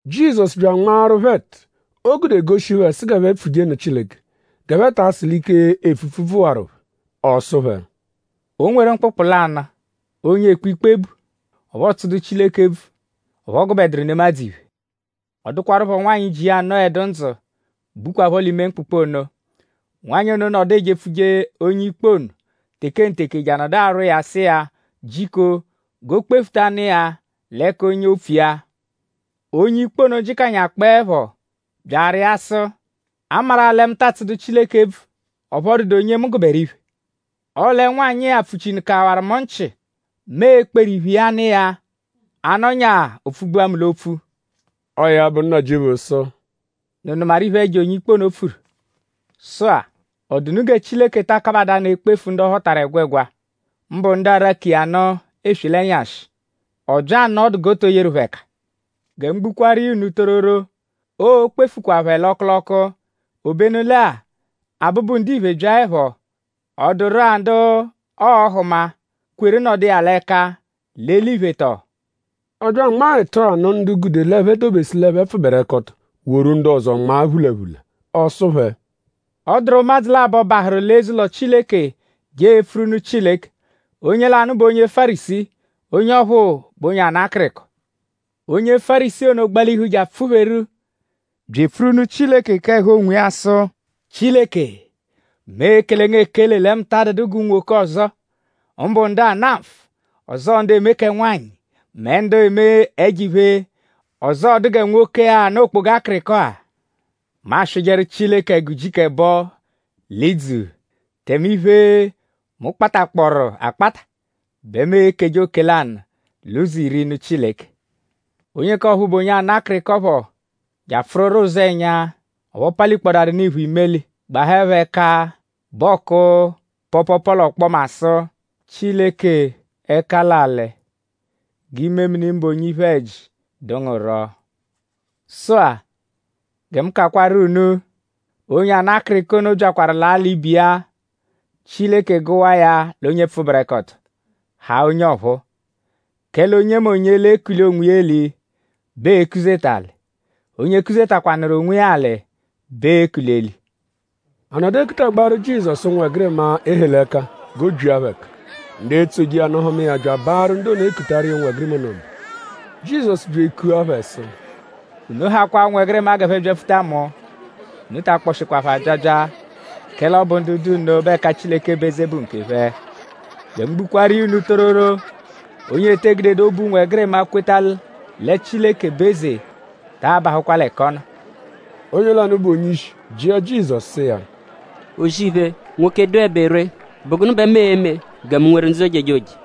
Jizọsu bya anmaaru phẹ ẹtu, o gude goshi phẹ sụ g'ẹphe pfuje nụ Chileke; g'ẹphe ta asụ l'ike epfupfu bvụwaru phẹ. Ọ sụ phẹ: “O nweru mkpụkpu lanụ, onye ekpe ikpe bu; ọphu ọotsudu Chileke ebvu; ọphu ọ gụbeduru nemadzụ iphe. Ọ dụkwarupho nwanyị, ji iya anọedu ndzụ, bukwaphọ l'ime mkpụkpu ono. Nwanyị ono nọdu ejepfuje onye-ikpe ono tekenteke je anọdu arwọ iya sụ iya jiko g'o kpefuta iya l'ẹka onye opfu iya. Onye-ikpe ono jịkanyakpoepho bya arịa sụ: ‘A maru-a lẹ mu ta atsụdu Chileke ebvu; ọphu ọ dụdu onye mu gụberu iphe; ọle nwanyị-a pfuchinụkawaru mu nchị. Mu e-kperu iphe iya nụ iya; a -nọnyaa o pfugbua mu l'opfu.’” Ọo ya bụ; Nnajịuphu sụ: “?Unu nụmaru iphe, ẹjo onye-ikpe ono pfuru? Sụ-a;?ọ dụ unu gẹ Chileke ta akabadaanụ ekpefu ndu ọ họtaru ẹgwegwa; mbụ ndu araku iya nụ eswe l'ẹnyashi??Ọobya anọ ọdu g'ọ tọ yeru phẹ ẹka? Gẹ mu gbukwaaru iya unu tororo; oo-kpefukwa phẹ l'ọku l'ọku. Obenu lẹ-a; Abụbu-Ndiphe -byaẹpho;?ọ dụru-a ndu ọo-hụma, kweru nọdu iya l'ẹka l'eliphe tọo?” Ọ bya anmaa ẹtu-a nụ ndu gude l'ẹphe dobesu l'ẹphe pfụberekoto; woru ndu ọzo nmaa phulaphula. Ọ sụ phẹ: “Ọ dụru ụmadzu labọ, bahụru l'eze-ụlo Chileke je epfuru nụ Chileke. Onye lanụ bụ onye Fárisii; onye ọphuu bụ onye ana akịriko. Onye Fárisii ono gbalihu je apfụ-pheru bya epfuru nụ Chileke k'ẹhu onwiya sụ: ‘Chileke; mu ekele ngu ekele lẹ mu ta adụdu g'unwoke ọzo; mbụ ndu ana nfụ; ọzoo ndu eme kẹ nwanyị; mẹ ndu eme ẹjo-iphe; ọzoo dụ gẹ nwoke-a ana okpoga akịriko-a. Mu aswịjeru Chileke ẹgu ujiku ẹbo l'idzu; tẹme iphe, mu kpatakpọru akpata bẹ mu ekeje oke-lanụ-l'ụzo-iri; nụ Chileke.’ Onye k'ọphuu, bụ onye ana akịriko phọ je apfụruro ụzenya; ọphu ọ palikpọdarunu iphu imeli; gbahaẹpho ẹka bẹ ọoku pọopoopo l'ọkpoma sụ: ‘Chileke ẹka l'alị! G'imemini mụbe onye iphe-ẹji dụ ngu rọ!’ Sụ-a; gẹ mu kakwaru unu; onye ana akịriko ono byakwaru ala ibe iya; Chileke gụwa iya l'onye pfụberekoto; haa onye ọphuu; kẹle onyemonye, l'ekuli onwiya eli bẹ ee-kuzeta alị; onye kuzetakwanụru onwiya alị bẹ ee-kuli eli.” A nọdu ekutagbaaru Jizọsu ụnwegirima, e he l'ẹka g'o byia phẹ ẹka. Ndu etsoje iya nụ hụma iya bya abaarụ ndu ono, ekutaru iya ụnwegirima ono mba. Jizọsu bya ekua phẹ sụ: “Unu hakwaa ụnwegirima g'ẹphe byapfuta mu; unu ta akpọshikwa phẹ abyabya; kẹle ọ bụ ndu dụ nno bẹ ẹka Chileke bụ eze bụ nkephẹ. Gẹ mu gbukwaaru iya unu tororo; onye ete gudedu obu ụnwegirima kweta lẹ Chileke bụ eze taa bahụkwa ẹka ọ nọ.” Onye lanụ, bụ onye-ishi jịa Jizọsu sụ iya: “O-zì-iphe, nwoke, dụebe ree;?bụ gụnu bẹ mu e-me gẹ mu nweru ndzụ ojejoje?”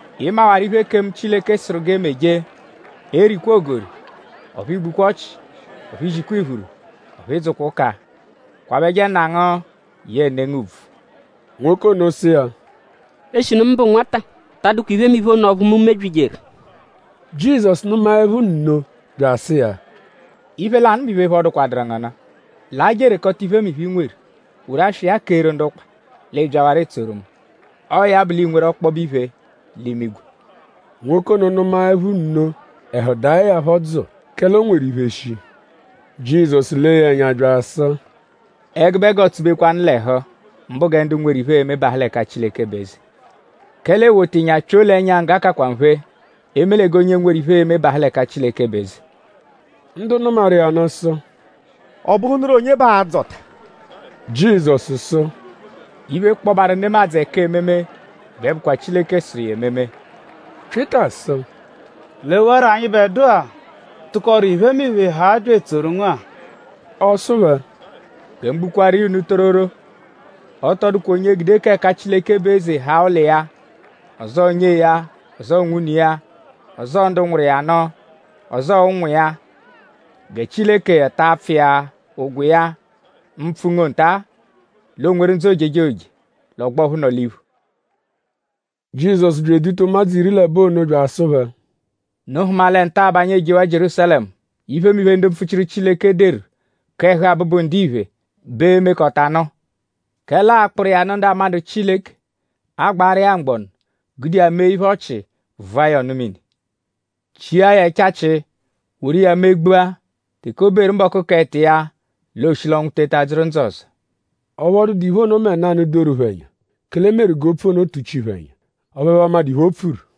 Ị mawaru iphe, ekemu Chileke sụru g'e meje: ‘Erikwa ogori; ọphu i gbukwa ọchi; ọphu i zikwa iphuru; ọphu ị dzụkwa ụka; kwabẹje nna ngu yẹe ne ngu ùbvù.’” Nwoke ono sụ iya: “Eshinu mu bụ nwata ta adụkwa iphemiphe ono ọphu mu mebyijeru.” Jizọsu nụmaepho nno bya asụ iya: “Iphe lanụ bụ iphe, phọdukwaduru ngu nụ; laa je erekọta iphemiphe, i nweru; woru aswa iya keeru ndu ụkpa; l'ị byawarọ etsoru mu. Ọo ya bụ l'iinweru ọkpobe iphe l'imigwe.” Nwoke ono nụmaepho nno; ẹhu daẹ ya phọ dzụu; kẹle o nweru iphe shii. Jizọsu lee ya ẹnya bya asụ: “Ẹgube g'ọotsubekwanu l'ẹhu; mbụ gẹ ndu nweru iphe e-me bahụ l'ẹka Chileke bụ eze. Kẹle ewota ịnya pyoo l'ẹnya ngga kakwa nphe; eme lẹ g'onye nweru iphe e-me bahụ l'ẹka Chileke bụ eze.” Ndu nụmaru iya nụ sụ: “?Ọ bụhunuru onye bẹ aa-dzọta?” Jizọsu sụ: “Iphe kpọbaru nemadzụ ẹka ememe bẹ bụkwa Chileke sụru iya ememe.” Pyịta sụ: “Lewarọ anyịbedua, tụkoru iphemiphe haa bya etsoru ngu-a.” Ọ sụ phẹ: “Gẹ mu gbukwaaru iya unu tororo; ọ tọ dụkwa onye gude k'ẹka Chileke bụ eze; haa ụlo iya; ọzoo nyee ya; ọzoo nwune iya; ọzoo ndu nwụru iya nụ; ọzoo ụnwu iya; gẹ Chileke ta apfụ iya ụgwo iya mpfụ-ngo nta; l'o nweru ndzụ ojejoje l'ọgbo ọphu nọ l'iphu.” Jizọsu bya eduta ụmadzu iri l'ẹbo ono bya asụ phẹ: “Unu hụma lẹ nta-a bẹ anyi ejewaa Jierúsalẹmu. Iphemiphe, ndu mpfuchiru Chileke deru k'ẹhu Abụbu-Ndiphe bẹ e-mekọtanu. Kẹle aa-kpụru iya nụ ndu amadụ Chileke; aa-gbaru iya mgbọnu; gude iya mee iphe ọchi; vụa ya ọnu-mini; chia ya ẹchachi; woru iya megbua. Teke o beru mbọku k'ẹto iya l'ooshi l'ọnwu teta dzụru ndzụ ọzo.” Ọphu ọ dụdu iphe ono mẹ nanụ, doru phẹ ẹnya; kẹle e meru g'opfu ono tụchi phẹ ẹnya; ọphu ẹphe amadụ iphe, o pfuru.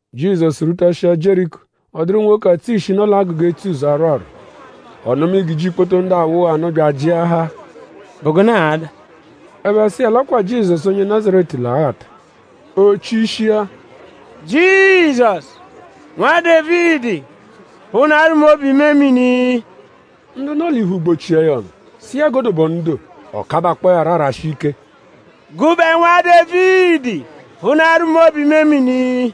Jizọsu rwutashịa Jieriko; ọ dụru nwoke, atsụ ishi, nọ l'agụga etsuzọ arwọ arwọ. Ọ nụma igiji ikpoto ndu awụgha nụ; bya ajịahaa: “?Bụ gụnu ada?” Ẹphe sụ iya l'ọ kwa Jizọsu onye Nazaretu l'aghata. O chishia: “Jizọsu! Nwa Dévidi! Phụnaaru mu obu-imemini.” Ndu nọ l'iphu gbọchia ya ọnu; sụ iya g'o dobe ọnu doo. Ọ kabakpọo ya rọ arashi ike: “Gụbe Nwa Dévidi! Phụnaaru mu obu-imemini.”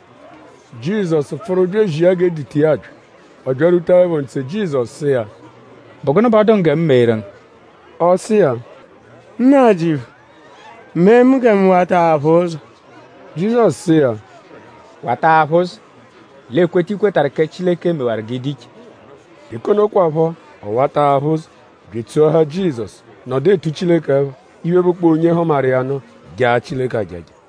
Jizọsu pfụru bya ezia g'e duta iya bya. Ọ byarwutaẹpho ntse; Jizọsu sụ iya: “?Bụ gụnu bẹ ọ dụ ngu gẹ mu meeru ngu?” Ọ sụ iya: “Nnajịuphu; mee gẹ mu wata aphụ ụzo.” Jizọsu sụ iya: “Wata aphụ ụzo; l'ekweta, i kwetarụ kẹ Chileke mewaru g'ị dụ iche.” Teke ono kwaphọ; ọ wata aphụ ụzo; bya etsoahaa Jizọsu; nọdu etu Chileke ẹpha. Iphe, bụkpoo onye hụmaru iya nụ jaa Chileke ajaja.